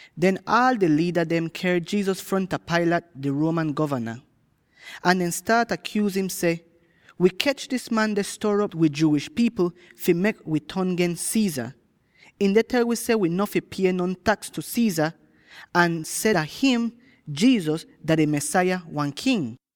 Den, aal di liida dem ker Jesus fronta Pilate, di Roman Govana. Ahn dehn staat akyuuz im seh, “Wi kech dis man deh stor'op wi Jewish pipl fi mek wi ton gens Caesar. Ihn deh tel wi seh wi no fi pie non taks tu Caesar, ahn seh dah him, Jesus, dah di Mesaya, wan king!”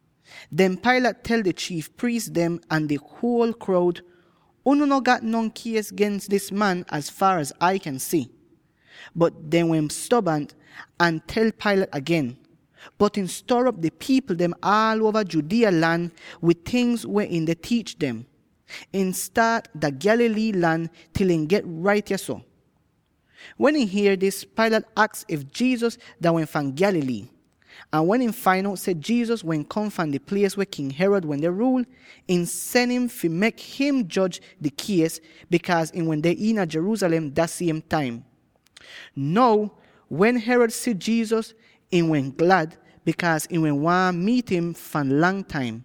Den Pilate tel di chiif priis dem ahn di huol kroud, “Unu no gat non kies gens dis man az faar az Ai kyan si.” Bot dehn wehn stobant ahn tel Pilate agen, “Bot ihn stor'op di pipl dem aal uova Judea lan wid tingz weh ihn deh tiich dem. Ihn staat dah Galilee lan til ihn get rait yahso.” Wen ihn hier dis, Pilate aks if Jesus dah wehn fahn Galilee. Ahn wen ihn fain out seh Jesus wehn kom fahn di plies weh King Herod wende ruul, ihn sen im fi mek him joj di kies, bikaaz ihn wende iina Jerusalem dah siem taim. Now, wen Herod si Jesus, ihn wehn glad, bikaaz ihn wehn waahn miit im fahn lang taim;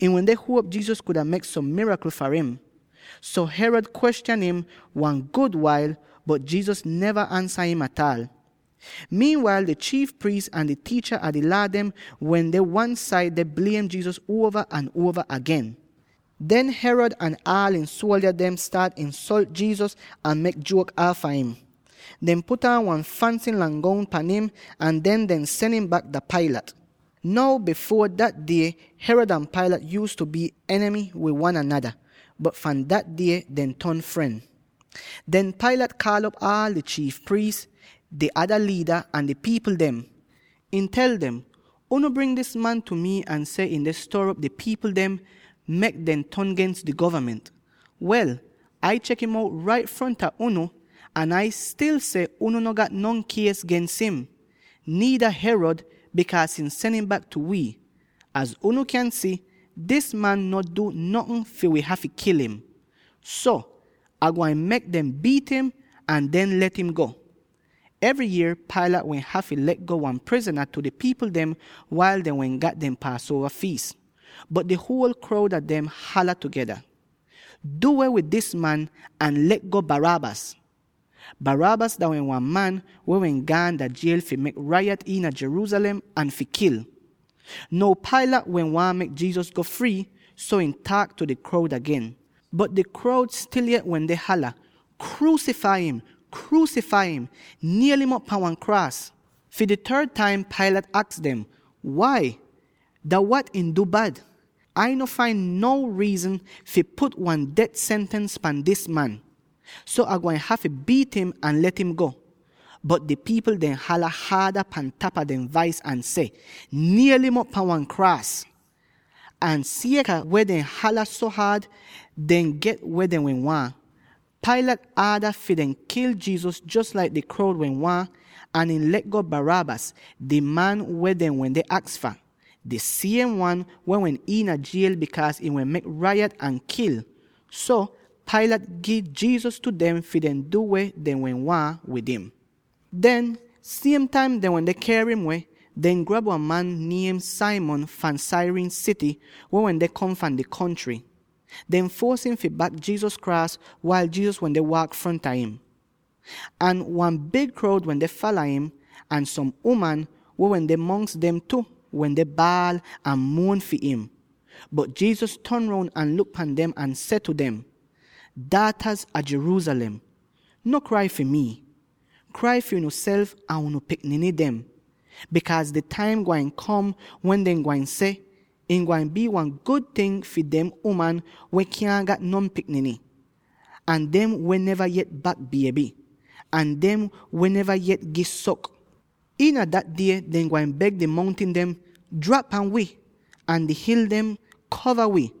ihn wende huop Jesus kuda mek som mirakl far im. So Herod kwestyan im wan gud wail, bot Jesus neva ansa im ataal. Wail dah taim kom, di chiif priis ahn di tiicha a di Laa dem wende wan-said deh bliem Jesus uova ahn uova agen. Den Herod ahn aal ihn suoldya dem staat insolt Jesus ahn mek juok aafa im. Dehn put aan wan fansy lang goun pan im, ahn den dehn sen im bak dah Pilate. Now bifuor dah die, Herod ahn Pilate yuuztu bii enimy wid wan anada, bot fahn dah die dehn ton fren. Den Pilate kaal'op aal di chiif priis, di ada liida, ahn di pipl dem. Ihn tel dem, “Unu bring dis man tu mi ahn seh ihn deh stor'op di pipl dem, mek dem ton gens di govament. Wel, Ai chek im out rait fronta unu, ahn Ai stil seh, unu no gat no kies gens im. Niida Herod, bikaaz ihn sen im bak tu wi. Az unu kyan si, dis man no du notn fi wi hafy kil im. So, Ah gwain mek dem biit im, ahn den let im go.” [Evry yier Pilate wehn hafy le'go wan prizna tu di pipl dem wail dehn wehn gat dehn Paasuova fiis.] Bot di huol kroud a dem hala tugeda, “Du weh wid dis man, ahn le'go Barabbas!” (Barabbas dah wehn wan man weh wehn gaan dah jiel fi mek rayat iina Jerusalem ahn fi kil.) Now Pilate wehn waahn mek Jesus go frii, so ihn taak tu di kroud agen. Bot di kroud stil yet wende hala, “Kruusifai im! Kruusifai im! Niel'im op pan wan kraas!” Fi di third taim Pilate aks dem, “Wai? Dah wat ihn du bad? Ai no fain no riizn fi put wan det sentens pan dis man. So Ah gwain hafy biit im ahn let im go.” Bot di pipl dem hala haada pan tapa dehn vais, ahn seh, “Niel'im op pan wan kraas!” Ahn sieka weh dehn hala so haad, dehn get weh dehn wehn waahn. Pilate aada fi dehn kil Jesus jos laik di kroud wehn waahn, ahn ihn le'go Barabbas, di man weh dehn wende aks fah —di siem wan weh wehn iina jiel bikaaz ihn wehn mek rayat ahn kil. So, Pilate gi Jesus tu dem fi dehn du weh dehn wehn waahn wid im. Den, siem taim dehn wende ker im weh, dehn grab wan man niem Simon fahn Cyrene sity, weh wende kom fahn di kontry. Dehn fuos im fi bak Jesus kraas wail Jesus wende waak fronta im. Ahn wan big kroud wende fala im, ahn som uman —weh wende mongs dem tu— wende baal out ahn muon fi im. Bot Jesus ton roun ahn luk pan dem ahn seh tu dem, “Daataz a Jerusalem, no krai fi mii; krai fi unuself ahn unu pikniny dem. Bikaaz di taim gwain kom wen dehn gwain seh, ‘Ih gwain bii wan gud ting fi dem uman weh kyaahn gat non pikniny, ahn dem weh neva yet bak bieby, ahn dem weh neva yet gi sok.’ Iina Dat Die dehn gwain beg di mountin dem, ‘Drap pan wi!’ ahn di hil dem, ‘Kova wi!’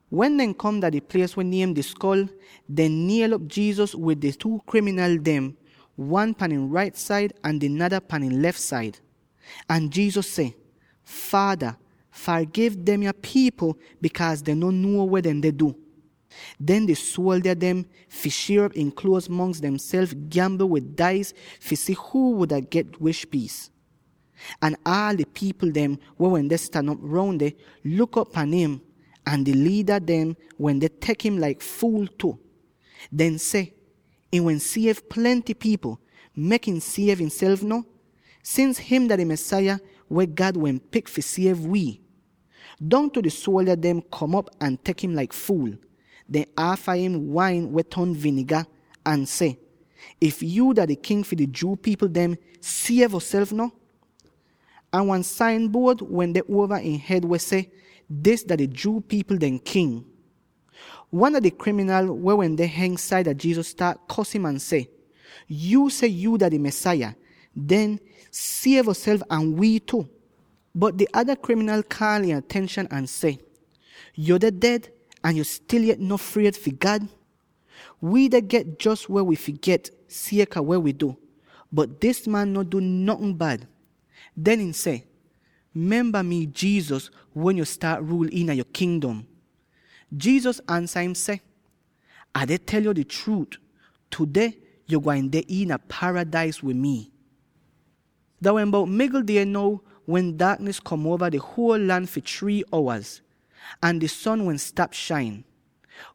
Wen dehn kom dah di plies weh niem Di Skol, dehn niel'op Jesus wid di two kriminal dem —wan pahn ihn rait said ahn di nada wan pahn ihn lef said. Ahn Jesus seh, “Faada, fargiv demya pipl, bikaaz dehn no nuo weh dehn deh du.” Den di suoldya dem, fi shier op ihn kluoz mongs dehnself, gyambl wid dais fi si huu wuda get wish piis. Ahn aal di pipl dem, weh wende stan op roun deh, luk op pan im; ahn di liida dehn wende tek im laik fuul tu. Dehn seh, “Ihn wehn siev plenty pipl; mek ihn siev ihnself no, sins him dah di Mesaya weh God wehn pik fi siev wi!” Dongtu di suoldya dem kom op ahn tek im laik fuul. Dehn aafa im wain weh ton viniga, ahn seh, “If yuu dah di King fi di Jew pipl dem, siev yoself no.” Ahn wan sain buod wende uova ihn hed weh seh, “Dis dah di Jew pipl dehn King.” Wan a di kriminal weh wende heng saida Jesus staat kos im ahn seh, “Yuu seh yuu dah di Mesaya, den siev yoself ahn wii tu!” Bot di ada kriminal kaal ihn atenshan ahn seh, “Yo deh ded, ahn yo stil yet no fried fi God? Wii deh get jos weh wi fi get, sieka weh wi du, bot dis man no du notn bad.” Den ihn seh, “Memba mi, Jesus, wen yo staat ruul iina yo Kingdom.” Jesus ansa im seh, “Ah deh tel yo di chruut: tudeh yo gwain deh iina paradais wid mi.” Dah wehn bout migl die now, wen daaknis kom uova di huol lan fi three owaz, ahn di son wehn stap shain.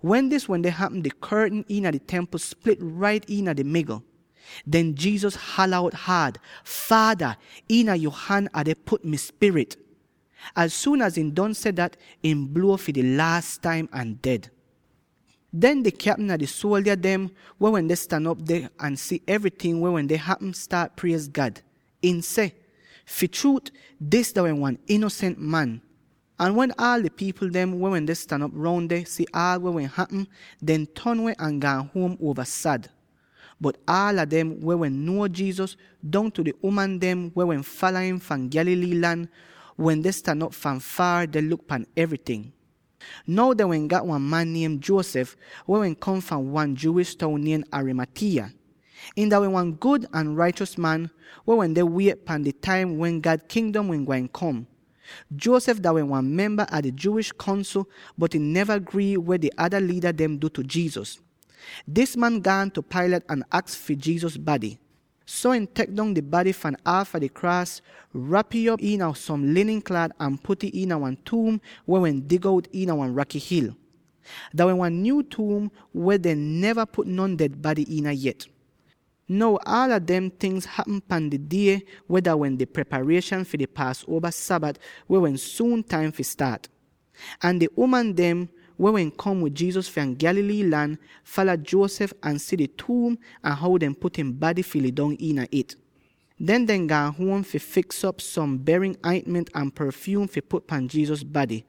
Wen dis wende hapm, di kortn iina di Templ split rait iina di migl! Den Jesus hala out haad, “Faada, iina yo han, Ah deh put, mi spirit.” Az suun az ihn don seh dat, ihn bluo fi di laas taim ahn ded. Den di kyapm a di suoldya dem, weh wende stan op deh ahn si evryting weh wende hapm, staat priez God. Ihn seh, “Fi chruut, dis dah wehn wan inosent man!” Ahn wen aal di pipl dem weh wende stan op roun deh, si aal weh wende hapm, dehn ton weh ahn gaan huom uova sad. Bot aala dem weh wehn nuo Jesus, —dongtu di uman dem weh wehn fala im fahn Galilee lan— wende stan op fahn foor, deh luk pan evryting. Now dehn wehn gat wan man niem Joseph, weh wehn kom fahn wan Jewish toun niem Arimathea. Ihn dah wehn wan gud ahn raichos man, weh wende wiet pan di taim wen God Kingdom wehn gwain kom. Joseph dah wehn wan memba a di Jewish Kongsl, bot ihn neva grii wid weh di ada liida dem du tu Jesus. Dis man gaan tu Pilate ahn aks fi Jesus bady. So ihn tek dong di bady fahn aafa di kraas, rap'ih op iina som linin klaat ahn put'ih iina wan tuum weh wehn dig out iina wan raky hil. Dah wehn wan nyuu tuum weh dehn neva put non ded bady iina yet. Now aala demde tingz hapm pan di die weh dah wehn di preparieshan fi di Paasuova Sabat weh wehn suun taim fi staat. Ahn di uman dem —weh wehn kom wid Jesus fahn Galilee lan— fala Joseph ahn si di tuum ahn how dehn put ihn bady fi lidong. Den dehn gaan huom fi fiks'op som berin aintment ahn porfyuum fi put pan Jesus bady.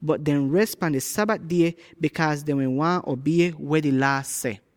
Bot dehn res pan di Sabat die, bikaaz dehn wehn waahn obie weh di Laa seh.